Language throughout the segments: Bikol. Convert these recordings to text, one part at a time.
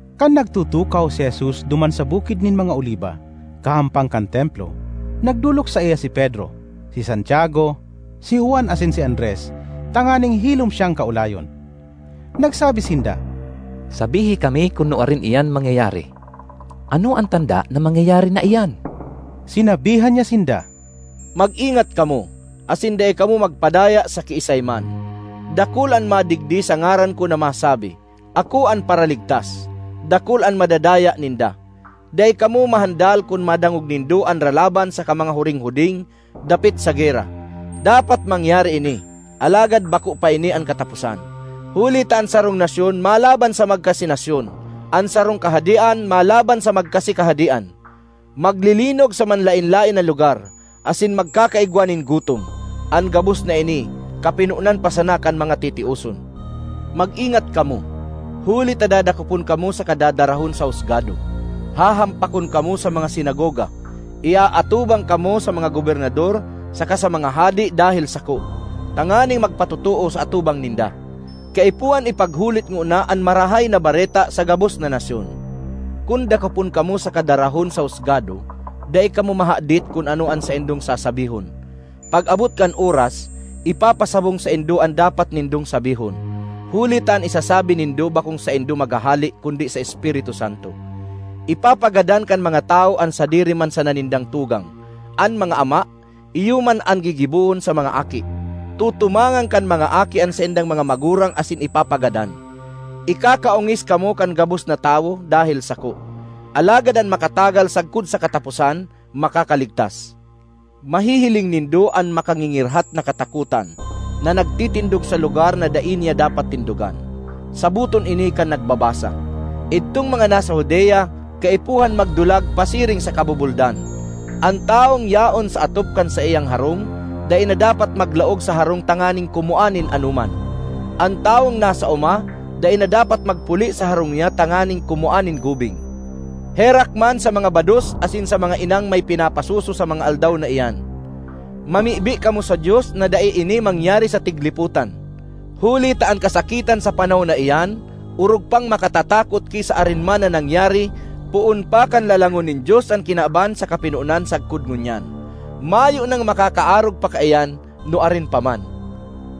Kan nagtutukaw si Jesus duman sa Bukid nin mga Oliba, kahampang kan Templo, nagdolok saiya si Pedro, si Santiago, si Juan asin si Andres tanganing hilom siyang kaolayon. Nagsabi sinda, “Sabihi kami kun nuarin iyan mangyayari. Ano an tanda na mangyayari na iyan?” Sinabihan niya sinda, “Mag-ingat kamo, asin dai kamo magpadaya sa kiisay man. Dakul an madigdi sa ngaran ko na masabi, ‘Ako an Paraligtas!’ Dakul an madadaya ninda. Dai kamo mahandal kun madangog nindo an ralaban saka mga huringhuding dapit sa gera. Dapat mangyari ini, alagad bako pa ini an kataposan. Huli ta an sarong nasyon malaban sa magkasi nasyon, an sarong kahadean malaban sa magkasi kahadean. Maglilinog sa manlaen-laen na lugar, asin magkakaigwa nin gutom. An gabos na ini kapinonan pa sana kan mga titioson. ”Mag-ingat kamo, huli ta dadakopon kamo saka dadarahon sa husgado. Hahampakon kamo sa mga sinagoga; iaatubang kamo sa mga gobernador saka sa mga hade dahel sako tanganing magpatotoo sa atubang ninda. Kaipuhan ipaghulit ngona an Marahay na Bareta sa gabos na nasyon. Kun dakopon kamo saka darahon sa husgado, dai kamo mahadit kun ano an saindong sasabihon; pag-abot kan oras, ipapasabong saindo an dapat nindong sabihon. Huli ta an isasabi nindo bakong saindo maghahale kundi sa Espiritu Santo. Ipapagadan kan mga tawo an sadiri man sana nindang tugang; an mga ama iyo man an gigibohon sa mga aki; tutumangan kan mga aki an saindang mga magurang asin ipapagadan. Ikakaongis kamo kan gabos na tawo dahel sako. Alagad an makatagal sagkod sa kataposan makakaligtas. ”Mahihiling nindo ‘An Makangingirhat na Katakotan’ na nagtitindog sa lugar na dai niya dapat tindogan.” (Saboton ini kan nagbabasa!) “Idtong mga nasa Judea, kaipuhan magdulag pasiring sa kabubuldan. An tawong yaon sa atop kan saiyang harong dai na dapat maglaog sa harong tanganing kumua nin anoman. An tawong nasa oma dai na dapat magpuli sa harong niya tanganing kumua nin gubing. Herak man sa mga bados asin sa mga inang may pinapasuso sa mga aldaw na iyan! Mamibi kamo sa Dios na dai ini mangyari sa tiglipotan! Huli ta an kasakitan sa panahon na iyan orog pang makatatakot ki sa arin man na nangyari poon pa kan lalangon nin Dios an kinaban sa kapinonan sagkod ngunyan. Mayo nang makakaarog pa kaiyan nuarin pa man.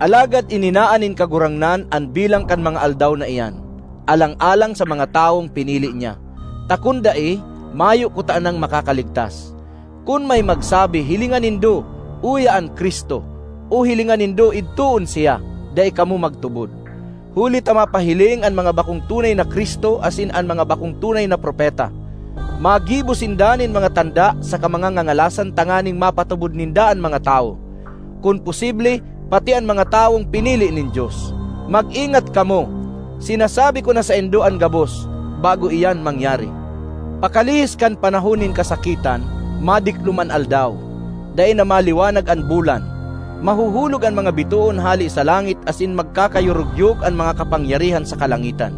Alagad ininaan nin Kagurangnan an bilang kan mga aldaw na iyan, alang-alang sa mga tawong pinili niya, ta kun dai, mayo kutanang makakaligtas. ”Kun may magsabi, ‘Hilinga nindo, uya an Cristo!’ o ‘Hilinga nindo, idtoon siya!’—dai kamo magtubod. Huli ta mapahiling an mga bakong tunay na Cristo asin an mga bakong tunay na propeta. Magibo sinda nin mga tanda saka mga ngangalasan tanganing mapatubod ninda an mga tawo, kun posible, pati an mga tawong pinili nin Dios. Mag-ingat kamo! Sinasabi ko na saindo an gabos bago iyan mangyari. ”Pakalihis kan panahon nin kasakitan, madiklom an aldaw, dai na maliwanag an bulan, mahuhulog an mga bitoon hale sa langit asin magkakayorogyog an mga kapangyarihan sa kalangitan.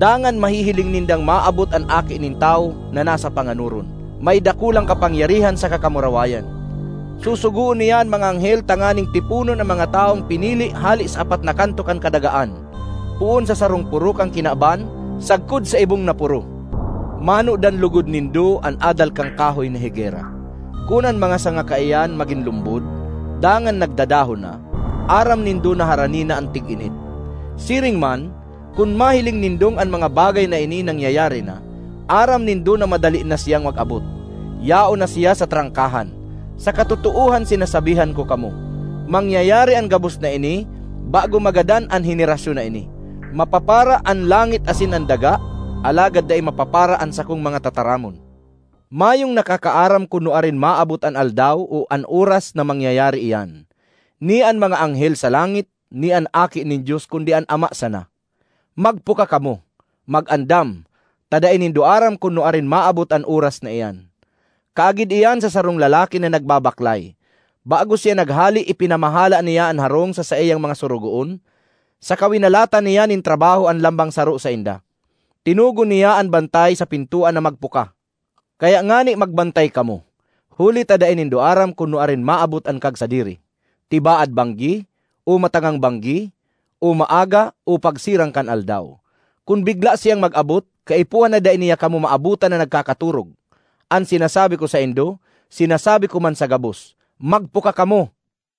Dangan mahihiling nindang maabot an Aki nin Tawo na nasa panganoron, may dakulang kapangyarihan saka kamurawayan. Susugoon niya an mga anghel tanganing tiponon an mga tawong pinili hale sa apat na kanto kan kadagaan poon sa sarong poro kan kinaban sagkod sa ibong na poro. ”Manodan logod nindo an adal kan kahoy na higera. Kun an mga sanga kaiyan magin lumbod, dangan nagdadahon na, aram nindo na harani na an tig-init. Siring man, kun mahiling nindong an mga bagay na ini nangyayari na, aram nindo na madali na siyang mag-abot, yaon na siya sa trangkahan. Sa katotoohan sinasabihan ko kamo, mangyayari an gabos na ini bago magadan an henerasyon na ini. Mapapara an langit asin an daga, alagad dai mapapara an sakong mga tataramon. ”Mayong nakakaaram kun nuarin maabot an aldaw o an oras na mangyayari iyan, ni an mga anghel sa langit, ni an Aki nin Dios kundi an Ama sana. Magpuka kamo, mag-andam, ta dai nindo aram kun nuarin maabot an oras na iyan. Kaagid iyan sa sarong lalaki na nagbabaklay. Bago siya naghale ipinamahala niya an harong sa saiyang mga sorogoon saka winalatan niya nin trabaho an lambang saro sainda. Tinugon niya an bantay sa pintoan na magpuka. Kaya ngani magbantay kamo, huli ta dai nindo aram kun nuarin maabot an kagsadiri—tibaad banggi, o matangang banggi o maaga o pagsirang kan aldaw. Kun bigla siyang mag-abot, kaipuhan na dai niya kamo maabotan na nagkakatorog! An sinasabi ko saindo, sinasabi ko man sa gabos: magpuka kamo!”